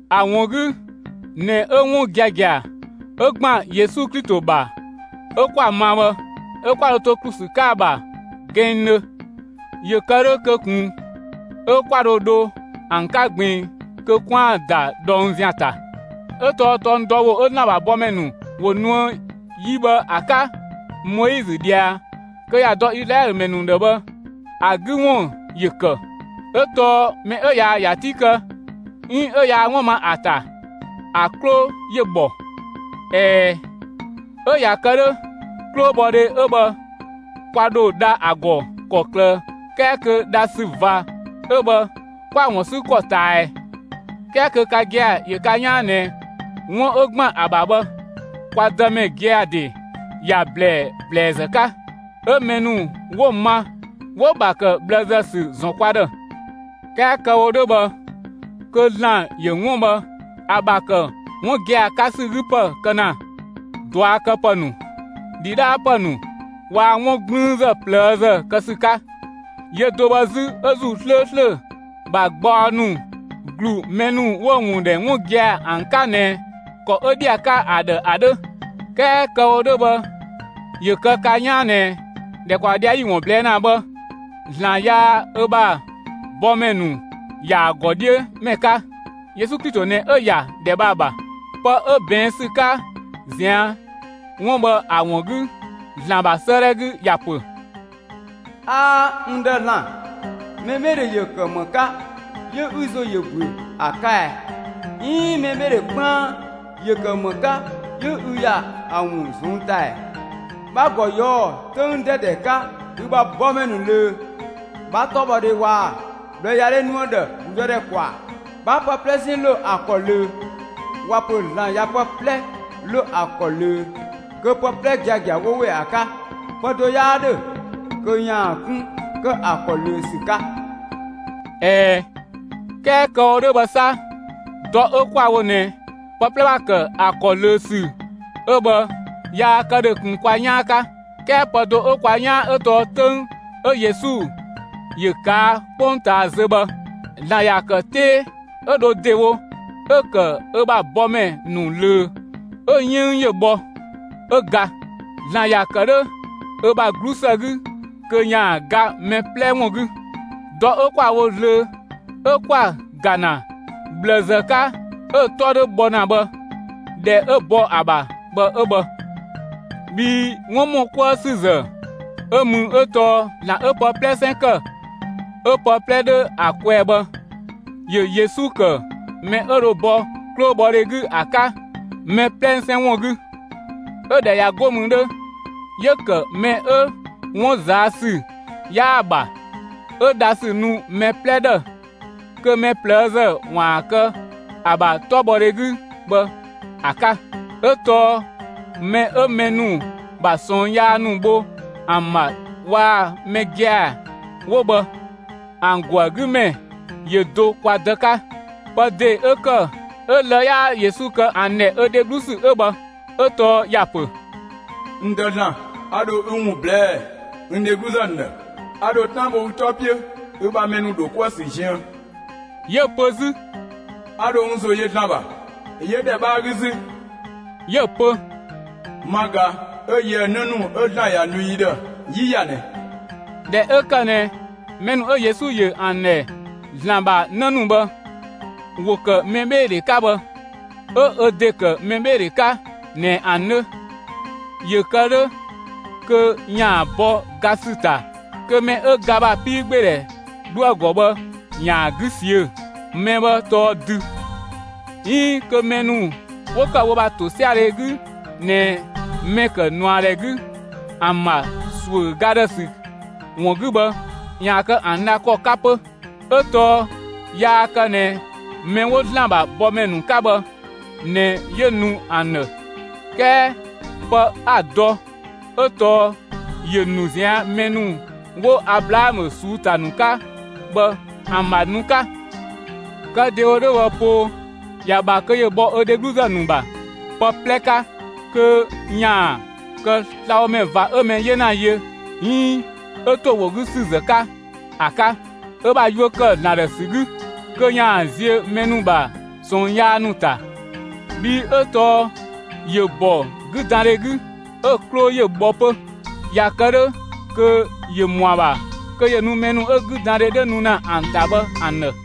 ‑A ‑wun 'gü ꞊nɛ 'ö 'wun giagia ('ö ‑gban Yesu Klito ‑bha) 'ö 'kwa‑ ma bhë, 'ö 'kwa dho to ‑klu ‑sü 'ka ‑a ‑bha gɛnngdhö, ‑yö kë 'dhö kö ꞊kun 'ö 'kwa dho dho ‑an 'ka ꞊gbiin kö 'kwaan‑ ‑da ꞊dhɔng ‑zian ‑ta; Ö tɔɔ tɔng dɔ ‑wo 'ö ‑Zlan ‑bha bɔmɛ ‑nu ‑wo nuë yi bhë ‑a 'ka (Moizö ꞊dhia kö ‑ya dɔ Izlaɛlö ‑mɛ ‑nu ‑dhë) bhë, ‑a 'gü ‑wun ‑yö ‑kë; 'ö tɔɔ mɛ 'ö yaa‑ ‑ya 'ti kë 'iin 'ö yaa 'wun ma ‑a ‑ta, ‑a 'klo ‑yö ‑bhɔ. ꞊Ɛɛ, 'ö ꞊ya kë 'dhö, 'klobhɔdhe 'ö bhë kwa ‑dho dha ‑a ‑gɔ ‑kɔklë 'kɛɛ kö dhasü ꞊va 'ö bhë 'kwa‑ ‑wun 'sü ‑kɔ ꞊taa ꞊ɛɛ? 'Kɛɛ kö ka gia‑ ‑yö ka 'yaan ꞊nɛ 'wun 'ö ‑gban ‑a ‑bha bhë, kwa Dëmɛ gia‑ ‑de ‑ya ‑blɛɛ ‑blɛɛzë 'ka. Ö mɛ ‑nu 'wo‑ ma 'wo‑ ‑bha ‑kë ꞊bhlëzë ‑sü ‑zɔn kwa ‑dhë. 'Kɛɛ kë‑ wo 'dhö bhë, kö ‑Zlan ‑yö 'wun bhë ‑a ‑bha ‑kë 'wun gia‑ 'ka ‑sü 'gü ‑pë kë ‑na ꞊duakëpë ‑nu, ‑dhidhaapë ‑nu waa‑ 'wun 'gblüünzë ꞊plëëzë kë ‑sü 'ka. Yö do bhë 'zü 'ö ‑Zuu 'slööslö ‑bha gbaɔ ‑nu ‑glu mɛ ‑nu 'wo‑ ‑wun ‑dhɛ 'wun gia‑ ‑an 'ka ꞊nɛ ‑kɔ 'ö ‑dhi ‑a 'ka ‑a ‑dhë ‑a 'dhö. 'Kɛɛ kë‑ wo 'dhö bhë, ‑yö kë ka 'yaan ꞊nɛ ‑dhɛkpaɔ ꞊dhia' 'yi‑ ‑wun ꞊blɛɛ' ‑na bhë, ‑Zlan yaa ö ‑bha bɔmɛ ‑nu ‑ya ‑a ‑gɔ 'dhiö ‑mɛ 'ka; (Yesu Klito ꞊nɛ 'ö ‑yadhɛ bhë ‑a ‑bha). Pë 'ö ꞊bɛɛn' ‑sü 'ka ꞊zian' 'wun bhë ‑a ‑wun 'gü ‑Zlan ‑bha 'sëëdhɛ 'gü ‑ya ‑pö: 'Aa, (n Dë ‑Zlan), mɛbheedhe ‑yö ‑kë ‑më 'ka 'yö ü ‑zo ‑yö ‑büö ‑a 'ka ɛ? 'Iin mɛbheedhe 'kpaan ‑yö ‑kë ‑më 'ka 'yö ü ‑ya ‑a ‑wun ꞊zɔnng' ‑ta ‑ɛ? 'Bha‑ ‑gɔ ꞊yɔɔ' 'töng 'dɛdɛ 'ka ü ‑bha bɔmɛ ‑nu ꞊löö; 'bha 'tɔbhɔdhe waa‑ ꞊bhlëyadhe nu ‑a ‑dhë ‑gludëdhɛ ‑kwaa. 'Bha pë 'plɛsɛn ‑lo ‑a ‑kɔ ꞊löö. ꞊Waa‑ pö ‑Zlan ꞊ya pë 'plɛ ‑lo ‑a ‑kɔ ꞊löö, kö pë 'plɛ giagia ꞊nɛ 'wo ‑we ‑a 'ka; pë do 'yaa 'dhö kö ‑yaan 'kun ‑kë ‑a ‑kɔ ꞊löö ‑sü 'ka. ꞊Ɛɛ, 'kɛɛ kë‑ wo 'dhö bhë 'sa, dɔ 'ö 'kwa‑ wo ꞊nɛ pë 'plɛ ‑bha ‑kë ‑a ‑kɔ ꞊löö ‑sü 'ö bhë yaa kë ‑dhö ꞊kun kwa 'yaan 'ka. 'Kɛɛ pë do 'ö kwa 'yaan 'ö tɔɔ 'töng 'ö Yesu ‑yö ꞊kaa' 'kpongtaa zö bhë ‑Zlan ‑ya ‑kë 'tee 'ö dho ‑dewo 'ö‑ ‑kë ö ‑bha bɔmɛ ‑nu ꞊löö, 'ö‑ 'yënng ‑yö bhɔ, 'ö ga. ‑Zlan ‑ya ‑kë 'dhö ö ‑bha 'glusë 'gü kö ‑yaan ga mɛ 'plɛ ‑wun 'gü. Dɔ 'ö 'kwa‑ wo zlöö 'ö 'kwa‑ ‑ga ‑na ꞊bhlëzë 'ka 'ö‑ 'tɔ 'dhö bhɔ ‑na bhë, ‑dhɛ 'ö bɔ ‑a ‑bha bhë 'ö bhë. Bhii 'wun ‑mɔ 'kuë ‑sü ‑zë 'ö mü 'ö tɔɔ ‑Zlan 'ö pë 'plɛsɛn ‑kë 'ö pë 'plɛ 'dhö ‑a kwɛɛ bhë, ‑yö Yesu ‑kë mɛ 'ö dho bɔ 'klobhɔdhe 'gü ‑a 'ka mɛ 'plɛsɛn ‑wun 'gü; 'ö ꞊dhɛ ꞊ya 'go mü 'dhö, 'yö‑ ‑kë mɛ 'ö 'wun ꞊zaa' ‑sü 'yaa‑ ‑bha, 'ö dhasü nu mɛ 'plɛ ‑dhë, kö mɛ ꞊plëëzë ‑waan kë ‑a ‑bha 'tɔbhɔdhe 'gü bhë ‑a 'ka. 'Ö tɔɔ mɛ 'ö mɛ ‑nu ‑bha ꞊sɔɔn yaa ‑nu bho ‑an ‑bha waa‑ mɛ gia‑ 'wo bhë, ‑an ‑go ‑a 'gü ‑mɛ ‑yö do kwa Dë 'ka. Pë ‑de 'ö ‑kë 'ö lë‑ 'yaa Yesu kë ‑an ‑dhɛ ö dheglu ‑sü 'ö bhë. 'Ö tɔɔ ‑ya ‑pö: (N Dë ‑Zlan), a ‑dho ü ‑wun ꞊blɛɛ'‑ n dhegluzë ‑nu ‑dhë. A ‑dho 'tan bho ü 'tɔ 'piö ü ‑bha mɛ ‑nu ‑dho 'kuë‑ ‑sü ziën. 'Yö‑ pö 'zü: A ‑dho n ‑zo yö ‑Zlan ‑bha. 'Yö ‑dhɛ 'bhaa 'gü 'zü, 'yö‑ pö: Ma ꞊ga 'ö yië‑ 'në ‑nu 'ö ‑Zlan ‑ya nu n ‑dhë 'yi ‑ya ꞊nɛ. ꞊Dhɛ 'ö ‑kë ꞊nɛ mɛ ‑nu 'ö Yesu ‑yö ‑an ‑dhɛ ‑Zlan ‑bha 'në ‑nu bhë, ‑wo ‑kë mɛbheedhe 'ka bhë, 'ö ö ‑de ‑kë mɛbheedhe 'ka ꞊nɛ ‑an 'dhö, ‑yö kë 'dhö kö ‑yaan bɔ ga ‑sü ‑ta kö mɛ 'ö ga ‑bha 'piigbeedhɛ 'dhoë‑ ‑gɔ bhë ‑yaan 'gü ꞊siö'‑. Mɛ bhë tɔɔ dü; 'iin kö mɛ ‑nu 'wo ‑kë wo ‑bha ‑tosiadhe 'gü ꞊nɛ mɛ‑ ‑kë ꞊nuadhɛ 'gü ‑an ‑bha ‑suö ga ‑dhë ‑sü ‑wun 'gü bhë ‑yaan kë ‑an dha ‑kɔ 'ka 'pö. 'Ö tɔɔ yaa kë ꞊nɛ mɛ 'wo ‑Zlan ‑bha bɔmɛ ‑nu 'ka bhë ꞊nɛ 'yö nu ‑an ‑dhë; 'kɛɛ pë 'a‑ dɔ 'ö tɔɔ ‑yö ‑nu ꞊zian' mɛ 'wo Ablaamö ꞊suu'‑ ‑ta ‑nu 'ka bhë ‑an ‑bha nu 'ka. Kë ‑dewo 'dhö bhë poo, ‑ya ‑bha kö ‑yö bhɔ ö dhegluzë ‑nu ‑bha pë 'plɛ 'ka kö ‑yaan kë slabhomɛ ꞊va 'ö mɛ 'yena yö 'iin 'ö ‑to ‑wo 'gü ‑sü zë 'ka ‑a 'ka, ö ‑bha yuö ‑kë ‑Zlan ‑dhë ‑sü 'gü, kö ‑yaan ziö mɛ ‑nu ‑bha ꞊sɔɔn yaa ‑nu ‑ta; bhii 'ö tɔɔ ‑yö ‑bɔ 'güdandhe 'gü 'ö‑ 'klo ‑yö bhɔ 'pö; ꞊ya kë 'dhö kö ‑yö ‑mɔ ‑a ‑bha kö ‑yö nu mɛ ‑nu 'ö 'güdandhe 'dhö nu ‑na ‑an ‑ta bhë ‑an ‑dhë.